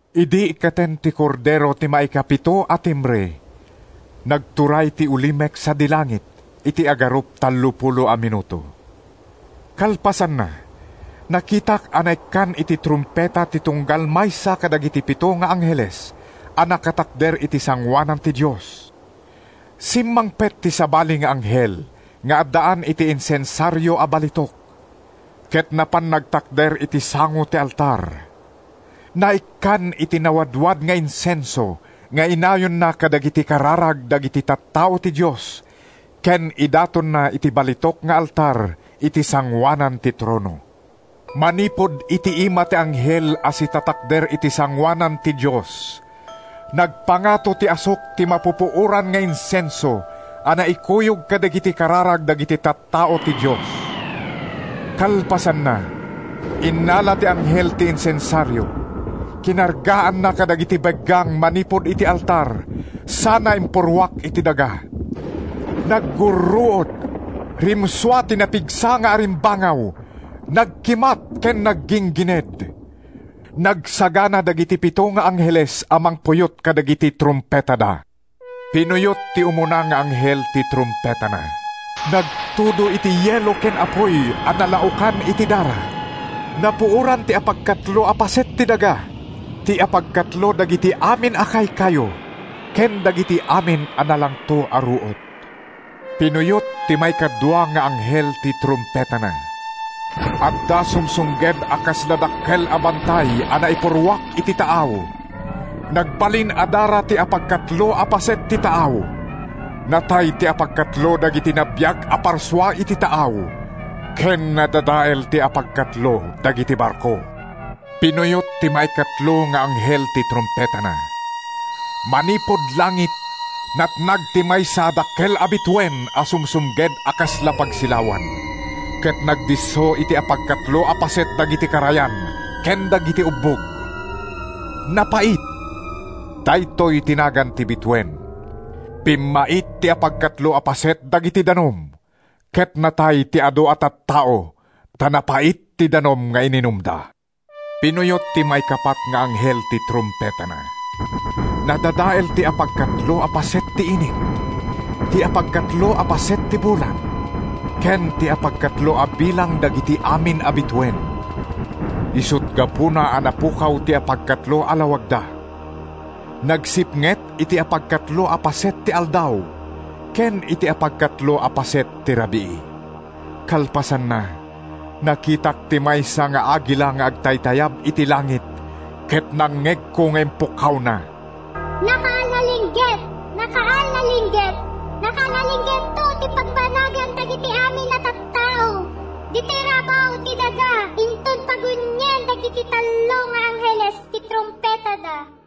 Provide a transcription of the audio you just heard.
Idi ikkaten ti Kordero ti maikapito a timbre, nagturay ti ulimek sadi langit iti agarup tallopulo a minuto. Kalpasanna, nakitak a naikkan iti trumpeta ti tunggal maysa kadagiti pito nga angheles a nakatakder iti sangoanan ti Dios. Simmangpet ti sabali nga anghel nga addaan iti insensario a balitok, ket napan nagtakder iti sango ti altar. Naikkan iti nawadwad nga insenso nga inayonna kadagiti kararag dagiti tattao ti Dios ken idatonna iti balitok nga altar iti sangoanan ti trono. Manipud iti ima ti anghel a sitatakder iti sangoanan ti Dios, nagpangato ti asuk ti mapupuoran nga insenso a naikuyog kadagiti kararag dagiti tattao ti Dios. Kalpasanna, innala ti anghel ti insensario, kinargaanna kadagiti beggang manipud iti altar sana impurruak iti daga. Naggurruod, rimsua ti napigsa nga arimbangaw, nagkimat ken nagginggined. Nagsagana dagiti pito nga angheles a mangpuyot kadagiti trumpetada. Pinuyot ti umuna nga anghel ti trumpetana. Nagtudo iti yelo ken apuy a nalaokan iti dara. Napuoran ti apagkatlo a paset ti daga, ti apagkatlo dagiti amin a kaykayo ken dagiti amin a nalangto a ruot. Pinuyot ti maikadua nga anghel ti trumpetana. Adda sumsumged a kasla dakkel a bantay a naipurruak iti taaw. Nagbalin a dara ti apagkatlo a paset ti taaw. Natay ti apagkatlo dagiti nabiag a parsua iti taaw ken nadadael ti apagkatlo dagiti barko. Pinuyot ti maikatlo nga anghel ti trumpetana. Manipud langit, natnag ti maysa a dakkel a bituen a sumsumged a kasla pagsilawan, ket nagdisso iti apagkatlo a paset dagiti karayan ken dagiti ubbog. (“Napait”—daytoy ti nagan ti bituen.) Pimmait ti apagkatlo a paset dagiti danum, ket natay ti adu a tattao ta napait ti danum nga ininumda. Pinuyot ti maikapat nga anghel ti trumpetana. Nadadael ti apagkatlo a paset ti init, ti apagkatlo a paset ti bulan ken ti apagkatlo a bilang dagiti amin a bituen, isut’ gapuna a napukaw ti apagkatlo a lawagda. Nagsipnget iti apagkatlo a paset ti aldaw ken iti apagkatlo a paset ti rabii. Kalpasanna, nakitak ti maysa nga agila nga agtaytayab iti langit ket nangngegko nga impukkawna: “Nakaal-alingget! Nakaal-alingget! Nakaal-alinggetto ti pagbanagan dagiti amin a tattao ditoy rabaw ti daga inton pagunien dagiti tallo nga angheles ti trumpetada.”